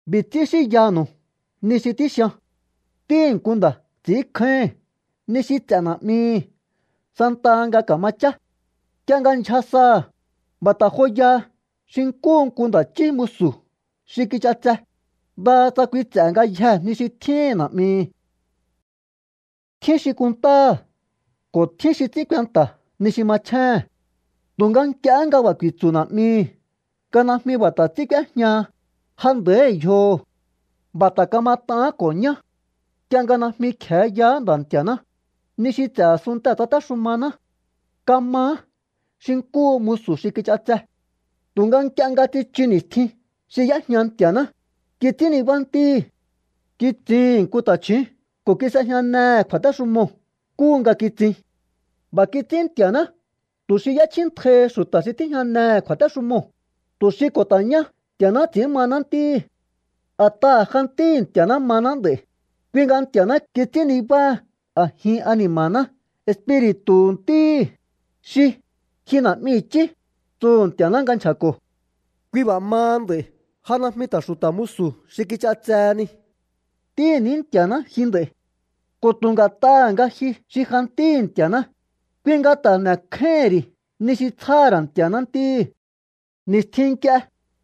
B'i̱ ts'ín xínyanu̱u ni xi tíxian. Ntíhi̱ nku nda̱ ts'i̱ínkjáíhi̱n ni xi ts'e̱ na̱'mihi̱ santaha nga ka̱ma chá. Nk'ie nga ndyja saha̱, b'a̱ ta̱ joya xi nkúhu nku nda̱ chí musu̱ xi kich'atse, ndaha tsa kui ts'e̱ ngayjee̱ ni xi tjíhi̱n na̱'mihi̱. Tjín xi kunntáha̱ ko̱ tjín xi ts'ín kuenta̱ ni xi machjéhe̱n. Tu̱nga nk'iehé nga b'a̱ ku̱i̱tsu̱ na̱'mihi̱ nga najmi b'a̱ ta̱ ts'ín k'úéjñaha, ja nda̱íhi̱ yjoho̱. B'a̱ ta̱ kamat'aán ko̱ ñá. Nk'ie nga najmi kje̱e yaá Nda̱ Nti̱a̱ná, ni xi ts'e̱ a̱sunntee̱ tsatéxumaná. Kamaá xi nkúhu musu̱ xi kich'atse. Tu̱nga nk'ie nga tsichu ni̱stjin xi y'éjña Nti̱a̱ná, kits'ín nibá Ntíhi̱. Kitsihi̱n nku ta̱chju̱ún ko̱ kis'ejñanehe̱ kju̱a̱téxumoo̱ nkúhu nga kitsin. B'a̱ kits'ín Nti̱a̱ná tu̱ xi y'échjíntjaihi xu̱ta̱ xi tíjñanehe̱ kju̱a̱téxumoo̱, tu̱ xi ko̱ ta̱ ñá Nti̱a̱ná ts'i̱ín mahaná ntíhi̱. A̱t'aha̱ ja ntíhi̱ Nti̱a̱ná mahaná nd'a̱i̱, kui nga Nti̱a̱ná kits'ín nibáha a̱jin ani̱ma̱ná Espiri̱tu̱hu̱ Ntíhi̱, xi: “¡Ji Na̱'mi i̱chí!”, tsuhu̱ Nti̱a̱ná nga nchja̱ko̱. Kui b'a̱ maha nd'a̱i̱ ja najmi ta̱ xu̱ta̱ musu̱ xi kich'atseheni. Ntíhi̱ ní Nti̱a̱ná ji nd'a̱i̱. Ko̱ tu̱ nga̱t'aha̱ nga ji xi ja ntíhi̱ Nti̱a̱ná, kui nga ta̱ n'e̱kjáíhi̱n ri̱ ni xi tsjáha̱ ra̱ Nti̱a̱ná ntíhi̱. Ni̱stjin nk'ie,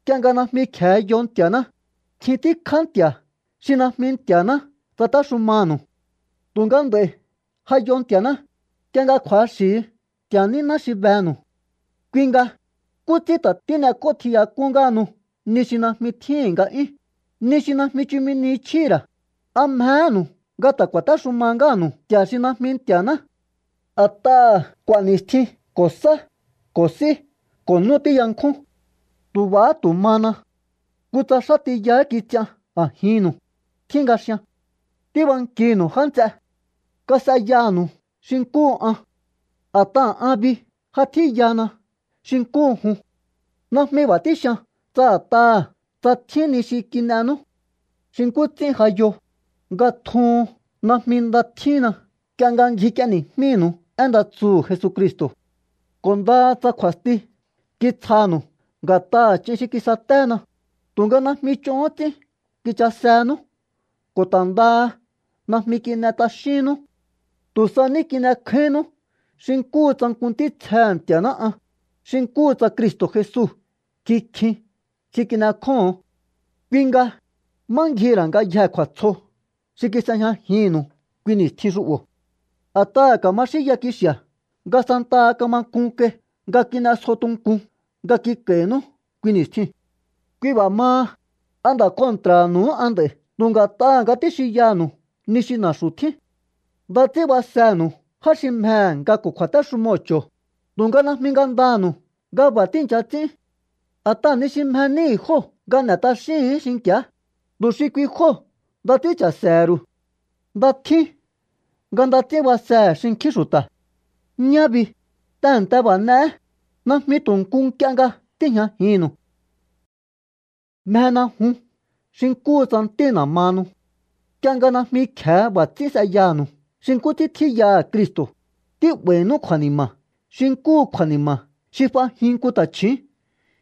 nk'ie nga najmi kje̱e yo Nti̱a̱ná, nkjin tíkjá nti̱a̱ xi najmi Nti̱a̱ná tsatéxumanu̱u. Tu̱nga nd'a̱i̱ ja yo Nti̱a̱ná, nk'ie nga kju̱axi̱hi Nti̱a̱ níná xi benu̱u. Kui nga, ¿nkú ts'ín ta̱ tín'ek'ótjiyak'ún ngáhanu ni xi najmi tjíhi̱n nga'yún, ni xi najmi chumi ni chjíhi̱ ra̱? ¿A mjehénu̱u nga ta̱ ku̱a̱téxuma ngáha̱nu̱u nti̱a̱ xi najmi Nti̱a̱ná? A̱t'aha̱ k'u̱a̱ ni̱stjin ko̱ sá ko̱ s'í ko̱ nú tíyankjún. Tu̱ b'a̱há tu̱ mana. Kutsa xá tiyahá kits'ian a̱jinnu̱u, tjín nga xian. Tíbankinu̱u, já nts'e. Kas'eyanu̱u xi nkúhu an. A̱t'aha̱ an bi ja tjíyana xi nkúhu jun. Najmi b'a̱ tíxian tsa a̱t'aha̱ tsa tjín ni xi kin'enú. Xi nkú ts'ín ja yo, nga tjuhun najmi nda tjínna nk'ie nga ngjik'ieni̱jmínu̱u én nda tsuhu̱ Jesucristo̱. Ko̱ ndaha tsa kju̱a̱sti kitsjanu̱u nga̱t'aha̱ ch'in xi kisaténa, tu̱nga najmi ch'ohón ts'ín kichasenú ko̱ ta̱ ndaha najmi kin'e t'axínnú. Tu̱ sa ní kin'ekjáínnú xi nkúhu tsa nku ntítsjehe̱ Nti̱a̱ná an, xi nkúhu tsa Cristo̱ Jesu kikjin xi kin'ekjóho̱on. Kui nga, ¿má ngjihi̱ ra̱ ngayjee̱ kju̱a̱tsjo xi kis'ejñajinnu̱u kui ni̱stjin xu'bo̱? A̱t'aha̱ ka̱ma xínya kixi̱a̱ nga santaha kama k'un kai nga kin'esjo tunkun nga kik'a̱i̱nú kui ni̱stjiu̱n. Kui b'a̱ maha, ¿a nda̱ kontra̱nu̱uhú an nd'a̱i̱ tu̱ nga̱t'aha̱ nga tíxinyanu̱u ni xi na̱xu̱ tjín? Nda ts'ín basenu̱u já xi mjehe̱ nga ko̱ kju̱a̱téxumoo̱ ch'o̱o, tu̱nga najmi ngandanu̱u nga b'a̱ tíi̱ncha ts'ín. A̱t'aha̱ ni xi mje níhi̱ jóo̱ nga n'e̱ t'axíhi̱ín xinki̱á, tu̱ xi kui jóo̱ nda ts'ín cha̱se̱he̱ru̱u. Nda tjín nga nda ts'ín basehe̱ xinkjín xu̱ta̱. Ñá bi, tehe̱nte b'a̱ n'e̱é, najmi tu̱ nku nk'ie nga tíi̱jñajinnu̱u. Mjena jun xi nkúhu tsa ntína̱ mahanu. Nk'ie nga najmi kje̱e b'a̱ ts'ín s'eyanu̱u xi nkú ts'ín tjíyaha̱ Cristo̱, tí'ba̱i̱nú kju̱a̱ni̱ma̱ xi nkúhu kju̱a̱ni̱ma̱ xi f'ajin nku ta̱chju̱ún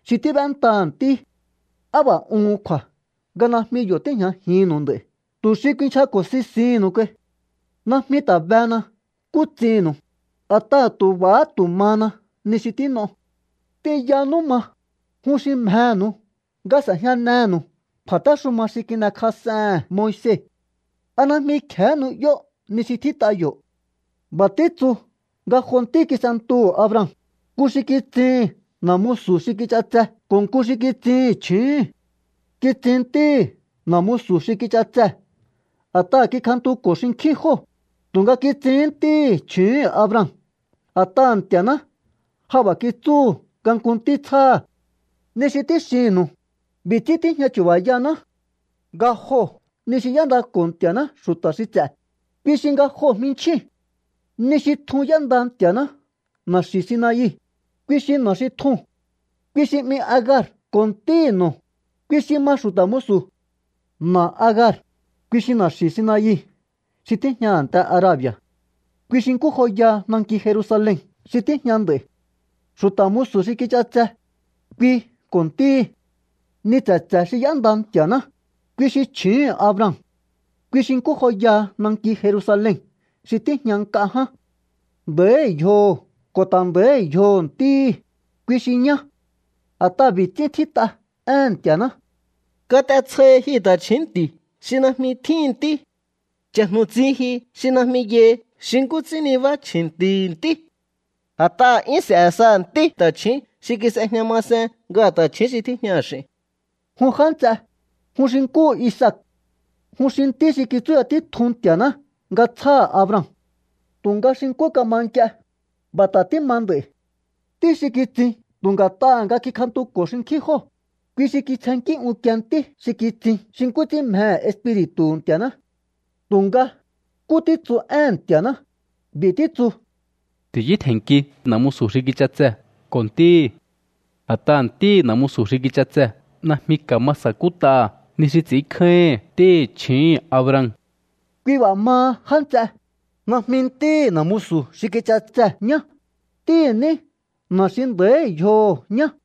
xi tíb'éntaha̱ ntí. ¡Á b'a̱ uhun kju̱a̱ nga najmi yo̱ tíi̱jñajihi̱nnu̱u nd'a̱i̱ tu̱ xi kuinchjako̱ sisihi̱nnu̱u kai! Najmi ta̱ behena nkú ts'innu̱u, a̱t'aha̱ tu̱ b'a̱há tu̱ mana ni xi tín'o. T'inyanú ma, jun xi mjenu̱u nga s'e̱jñanenu̱u Kju̱a̱téxuma xi kin'ekjas'ehe̱n Moise. ¿A najmi kje̱hé nu'yó ni xi tjít'a yo̱? B'a̱ títsu nga jo ntí kis'entuhu̱ Abraham, nku xi kitsihi̱n na̱ musu̱ xi kich'atse ko̱ nku xi kitsihi̱n chju̱úhu̱n. Kitsin ntíhi̱ na̱ musu̱ xi kich'atsee̱ a̱t'aha kikjantuko̱ xinkjín jóo̱, tu̱nga kitsihín ntíhi̱ chju̱úhu̱n Abraham a̱t'aha̱ Nti̱a̱ná ja b'a̱ kitsúhu̱ nga nku ntí tsjáha̱. Ni xi tíxinnu̱u, b'i̱ ts'ín tíjña chu̱ba̱yaná. Nga joo̱ ni xi y'éndako̱ Nti̱a̱ná xu̱ta̱ xi ts'e̱, kui xi nga joo̱ jminchjíu̱n. Ni xi tjun y'énda Nti̱a̱ná na̱xi̱ Sinai, kui xi na̱ xi tjuu̱n. Kui xi 'mi Agar ko̱ ntíhi̱ no̱, kui xi ma xu̱ta̱ musu̱. Na̱ Agar, kui xi na̱xi̱ Sinai xi tíjña a̱nte Arabi̱a̱. Kui xi nkú joyaha nanki Jerusalen xi tíjña nd'a̱i̱. Xu̱ta̱ musu̱ xi kich'atse kui ko̱ ntíhi̱. Ni tse̱tse̱ xi y'énda Nti̱a̱ná, kui xi chju̱úhu̱n Abraham. Kui xi nkú joyaha nanki Jerusalen xi tíjña nk'a ján. Nda̱íhi̱ yjoho̱ ko̱ ta̱ nda̱íhi̱ yjoho̱ ntíhi̱, kui xi ñá. A̱t'aha̱ b'i̱ ts'ín tjít'a éhe̱n Nti̱a̱ná: Kat'etsjohi ji ta̱chju̱ún nti̱ xi najmi tjíhi̱n ntí. Cha̱jnu̱tsin ji xi najmi yai xi nkú ts'ín nibá chji̱nti̱hi̱ ntí. A̱t'aha̱ 'yún s'e̱ saha̱ ntí ta̱chju̱ún xi kis'ejña masen nga ta̱chju̱ún xi tíjñaha̱ x'i̱n. Jun já nts'e, jun xi nkúhu Isaac. Jun xi ntí xi kitsúya títjun Nti̱a̱ná nga tsjáha̱ Abraham. Tu̱nga xi nkú kama nk'ie, b'a̱ ta̱ tíma nd'a̱i̱. Ntí xi kitsin tu̱ nga̱t'aha̱ nga kikjantuko̱ xinkjín jóo̱, kui xi kitsjennkí unkie ntí xi kitsin xi nkú ts'ín mjehe̱ Espiri̱tu̱hu̱ Nti̱a̱ná. Tu̱nga, ¿nkú títsu éhe̱n Nti̱a̱ná? B'i̱ títsu: “Ti̱yútje̱nnki na̱ musu̱ xi kich'atsee̱ ko̱ ntíhi̱. A̱t'aha̱ ntíhi̱ na̱ musu̱ xi kich'atsee̱ najmi ka̱ma sa̱kút'aha̱ ni xi ts'i̱ínkjáíhi̱n ntíhi̱ chju̱úhu̱n Abraham.” Kui b'a̱ maha, já nts'e, najmi ntíhi̱ na̱ musu̱ xi kich'atsee̱ ñá, ntíhi̱ ní na̱ xi nda̱íhi̱ yjoho̱ ñá.